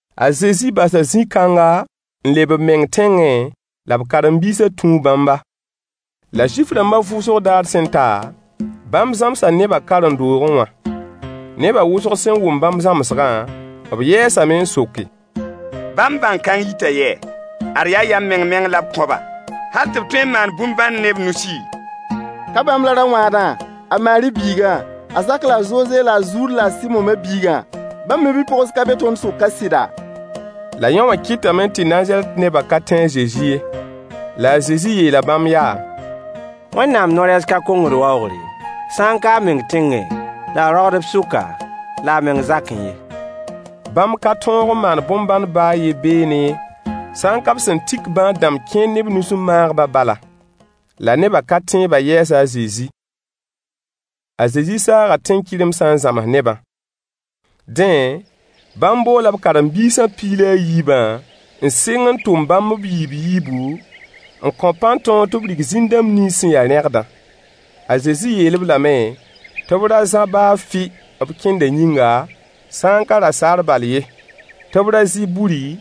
A Zezi basa zĩ-kãnga n leb b meng tẽngẽ, la b karen-biisã tũu bãmba. La Zuif-rãmbã vʋʋsg daar sẽn ta, bãmb zãmsa nebã karen-doogẽ wã. Neba wʋsg sẽn wʋm bãmb zãmsgã, b yɛɛsame n soke: Bãmb bãng-kãng yita yɛ? Ad yaa yam meng-meng la b kõ-ba, hal tɩ b tõe n maan bõn-bãn ne b nusi! Ka bãmb la ra-wãadã, a Maari biigã, a Zak la a Zoze la a Zuud la a Sɩmo ma-biigã? Bãmb ma-bi-pogs ka be tõnd sʋk ka sɩda? La yõwã kɩtame tɩ Nazarɛt nebã ka tẽ a Zezi ye. La a Zezi yeela bãmb yaa: Wẽnnaam no-rɛɛs ka kongd waoogre, sã n ka a meng tẽngẽ la a roagdb sʋka la a meng zakẽ ye. Bãmb ka tõog n maan bõn-bãnd baa a yen beene, sã n ka b sẽn tik bãad-dãmb kẽer ne b nus n maag-bã bala. La nebã ka-tẽebã yɛɛsa a Zezi. A Zezi saaga tẽn-kɩremsã n zãms nebã. Dẽ, bãmb boola b karen-biisã piig la a yiibã, n sɩng n tʋm bãmb b yiib-yiibu, n kõ-b pãn-tõog tɩ b rig zĩn-dãmb nins sẽn ya rẽgdã. A Zezi yeel-b lame tɩ b ra zã baa fʋɩ b kẽndã yĩnga, sã n ka rasaar bal ye. Tɩ b ra zã buri,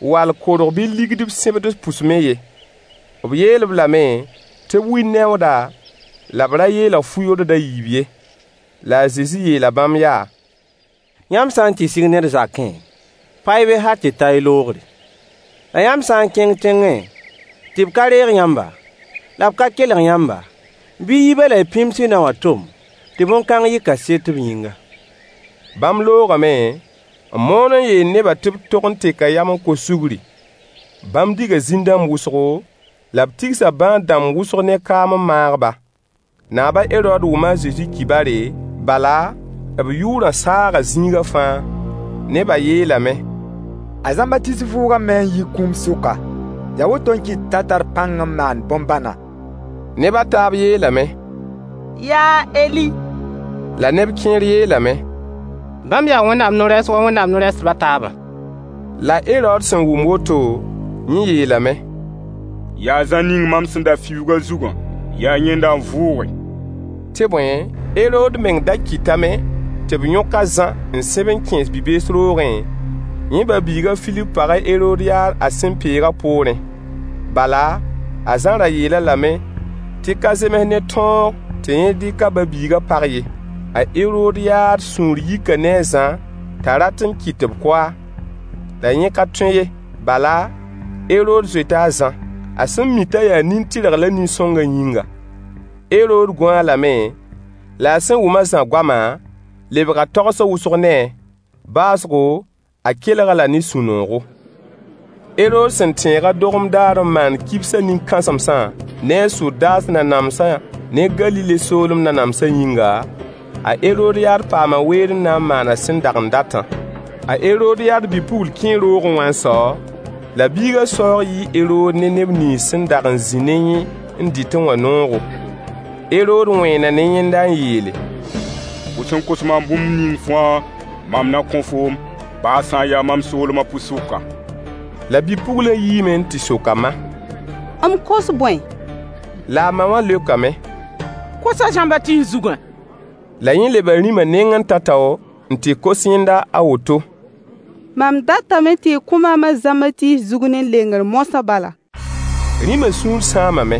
wall korg bɩ ligd b sẽbds pʋs me ye. B yeel-b lame tɩ b wid neooda la b ra yeelg fu-yord a yiib ye. La a Zezi yeela bãmb yaa: Yãmb sã n tɩ sig ned zakẽ, pa-y be hal tɩ ta y loogre. La yãmb sã n kẽng tẽngẽ tɩ b ka reeg yãmba, la b ka kelg yãmba, bɩ y yi be la y pĩms y naowã tom tɩ bõn-kãng yɩ kaset b yĩnga. Bãmb loogame n moon n yeel nebã tɩ b tog n teka yam n kos sugri. Bãmb diga zĩn-dãmb wʋsgo, la b tigsa bãad-dãmb wʋsg ne kaam n maag-ba. Naab a Herood wʋma a Zezi kibare, bala, b yʋʋrã saaga zĩigã fãa. Neba yeelame: A Zãmbatiis vʋʋgame n yi kũum sʋka. Yaa woto n kɩt t'a tar pãng n maand bõn-bãna. Neb a taab yeelame: Yaa a Eli! La neb kẽer yeelame: Bãmb yaa Wẽnnaam no-rɛɛs wa Wẽnnaam no-rɛɛsdb a taabã. La Herood sẽn wʋm woto, yẽ yeelame: Yaa Zã ning mam sẽn da fiuug a zugã. Yaa yẽnda n vʋʋge. Tɩ bõe, Herood meng da kɩtame tɩ b yõk a Zã n sẽb n kẽes bi-bees roogẽ, yẽ ba-biig a Filip pag a Herodyaad a sẽn peegã poorẽ. Bala, a Zã ra yeel-a lame tɩ ka zems ne tõog tɩ yẽ dɩk a ba-biigã pag ye. A Herodyaad sũur yika ne a Zã t'a rat n kɩt tɩ b kʋ-a. La yẽ ka tõe ye, bala, Herood zoeta a Zã, a sẽn mi t'a yaa nin-tɩrg la nin-sõngã yĩnga. Herood gũ-a lame, la a sẽn wʋm a Zã goamã, lebga tagsg wʋsg ne-a. Baoosgo, a kelg-a la ne sũ-noogo. Herood sẽn tẽeg a dogem daar n maan kibs a nin-kãsemsã ne a sodaas nanamsã ne Galile soolem nanamsã yĩnga, a Herodyaad paama weer n na n maan a sẽn dag n datã. A Herodyaad bi-pugl kẽe roogẽ wã n sao, la biigã saoog yɩɩ Herood ne neb nins sẽn dag n zĩ ne yẽ n dɩtẽ wã noogo. Herood wẽena ne yẽnda n yeele: Fo sẽn kos maam bũmb ning fãa, mam na kõ foom, baa sã n ya mam soolemã pʋɩ-sʋka. La bi-puglã yiime n tɩ sok a ma: M kos bõe? La a ma wã leokame: Kos a Zãmbatiis zugã. La yẽ leba rĩma nengẽ tao-tao n tɩ kos yẽnda a woto: Mam datame tɩ y kõ maam a Zãmbatiis zug ne lengr moasã bala. Rĩma sũur sãamame.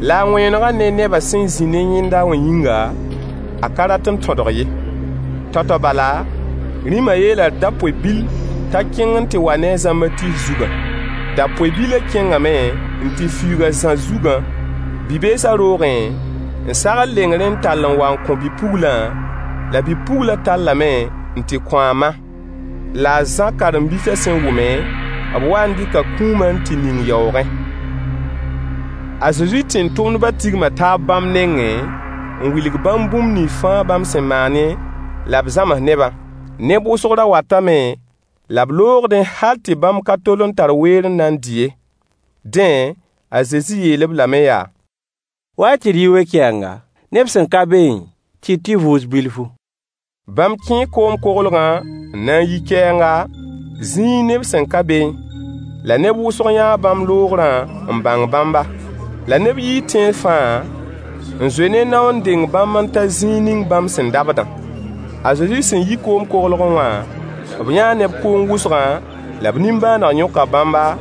La a wẽenegã ne neba sẽn zĩ ne yẽnda wã yĩnga, a ka rat n tõdg ye. Tao-tao bala, rĩmã yeela dapoe-bil t'a kẽng n tɩ wa ne a Zãmbatiis zugã. Dapoe-bilã kẽngame n tɩ fiuug a Zã zugã bi-beesã roogẽ n sagl lengrẽ n tall n wa n kõ bi-puglã, la bi-puglã tallame n tɩ kõ a ma. La a Zã karen-biisã sẽn wʋme, b waa n dɩka kũuma n tɩ ning yaoogẽ. A Zezi tẽn-tʋmdbã tigma taab bãmb nengẽ n wilg bãmb bũmb nins fãa bãmb sẽn maane, la b zãms nebã. Neb wʋsg ra watame la b loogdẽ hal tɩ bãmb ka tol n tar weer n na n dɩ ye. Dẽ, a Zezi yeel-b lame yaa: Wa-y tɩ d yi we-kɛɛnga, neb sẽn ka beẽ tɩ y tɩ vʋʋs bilfu. Bãmb kẽe koom-koglgã n na n yi kɛɛnga, zĩig neb sẽn ka beẽ. La neb wʋsg yãa bãmb loogrã n bãng bãmba. La neb yii tẽns fãa n zoe ne nao n deng bãmb n ta zĩig ning bãmb sẽn dabdã. A Zezi sẽn yi koom-koglgẽ wã, b yãa neb kʋʋng wʋsgã, la b nimbãaneg yõka bãmba,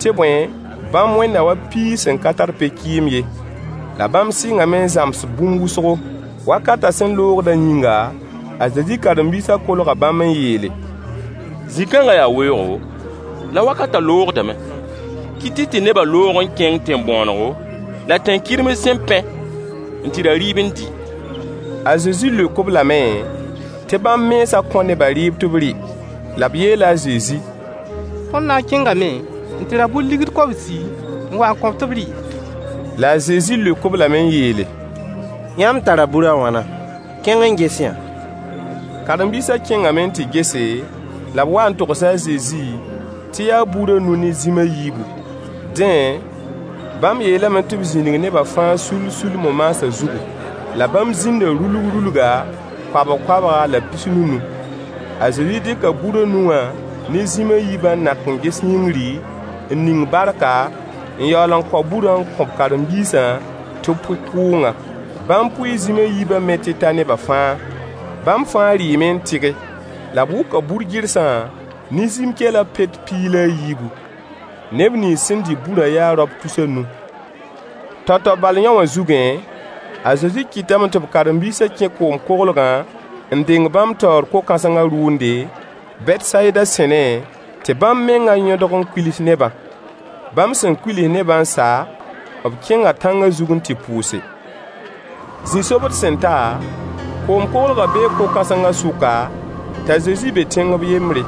tɩ bõe, bãmb wẽnda wa piis sẽn ka tar pe-kɩɩm ye. La bãmb sɩngame n zãms-b bũmb wʋsgo. Wakatã sẽn loogdã yĩnga, a Zezi karen-biisã kolga bãmb n yeele: Zĩ-kãngã yaa weoogo, la wakatã loogdame. Kɩt-y tɩ nebã loog n kẽng tẽn-bõonego la tẽn-kɩrems sẽn pẽ n tɩ ra dɩɩb n dɩ. A Zezi leok-b lame tɩ bãmb mensã kõ nebã rɩɩb tɩ b rɩ. La b yeela a Zezi: Tõnd na n kẽngame n tɩ ra bur deniye kobsi n wa n kõ-b tɩ b rɩ? La a Zezi leok-b lame n yeele: Yãmb tara bur a wãna? Kẽng n ges-y yã. Karen-biisã kẽngame n tɩ gese, la b wa n togs a Zezi tɩ yaa bur a nu ne zĩm a yiibu. Dẽ, bãmb yeelame tɩ b zĩnig nebã fãa sull-sull mo-maasã zugu. La bãmb zĩnda rulg-rulga, koabg-koabga la pis-nunu. A Zezi dɩka bur a nu wã ne zĩm a yiibã n nak n ges yĩngri, n ning barka, n yaool n kao burã n kõ b karen-biisã tɩ b pʋɩ kʋʋngã. Bãmb pʋɩɩ zĩm a yiibã me tɩ ta neba fãa. Bãmb fãa rɩɩme n tɩge. La b wʋka bur-gɩrsã ne zĩm-kɛlã peoog piig la a yiibu. Neb nins sẽn dɩ burã yaa raop tus a nu. Tao-tao bal yõwã zugẽ, a Zezi kɩtame tɩ b karen-biisã kẽ koom-koglgã n deng bãmb taoor ko-kãsengã rʋʋnde, Betsayida sẽne, tɩ bãmb mengã yõdg n kuils nebã. Bãmb sẽn kuils nebã n sa, b kẽnga tãngã zug n tɩ pʋʋse. Zĩ-sobd sẽn ta, koom-koglgã bee ko-kãsengã sʋka, t'a Zezi be tẽng b yembre.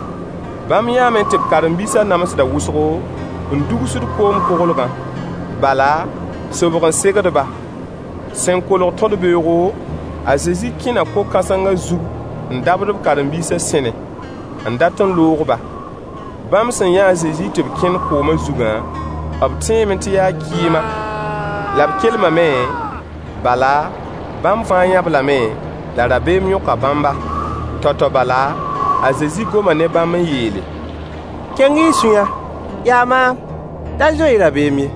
Bãmb yãame tɩ b karen-biisã namsda wʋsgo, n dugsd koom-koglgã, bala, sobg n segd-ba. Sẽn kolg tõd-beoogo, a Zezi kẽna ko-kãsengã zug n dabd b karen-biisã sẽne, n dat n loog-ba. Bãmb sẽn yã a Zezi tɩ b kẽnd koomã zugã, b tẽeme tɩ yaa kɩɩma, la b kelmame, bala, bãmb fãa yã-b lame, la rabeem yõka bãmba. Tao-tao bala, a Zezi goma ne bãmb n yeele: Keng-y y sũyã, yaa maam. Da zoe-y rabeem ye.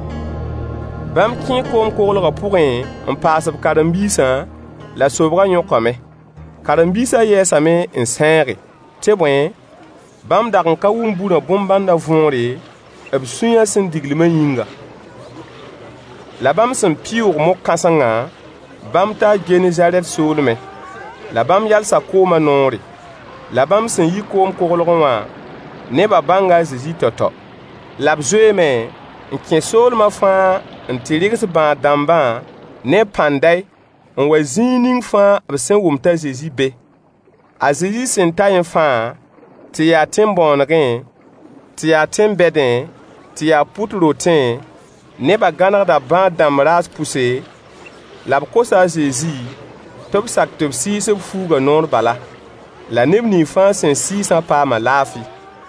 Bãmb kẽe koom-koglgã pʋgẽ n paas b karen-biisã, la sobgã yõkame. Karen-biisã yɛɛsame n sẽege, tɩ bõe, bãmb dag n ka wʋm burã bõn-bãndã võore, b sũyã sẽn diglmã yĩnga. La bãmb sẽn pɩʋʋg mog-kãsengã, bãmb taa Genezarɛt soolmẽ, la b yalsa koomã noore. La bãmb sẽn yi koom-koglgẽ wã, nebã bãnga a Zezi tao-tao. La b zoeeme n kẽ soolemã fãa n tɩ rɩgs bãad-dãmbã ne pãnday n wa zĩig ning fãa b sẽn wʋm t'a Zezi be. A Zezi sẽn taẽ fãa, tɩ yaa tẽn-bõonegẽ, tɩ yaa tẽn-bɛdẽ, tɩ yaa pʋt rotẽ, nebã gãnegda bãad-dãmb raas pʋse, la b kosa a Zezi tɩ b sak tɩ b sɩɩs b fuugã noor bala. La neb nins fãa sẽn sɩɩsã paama laafɩ.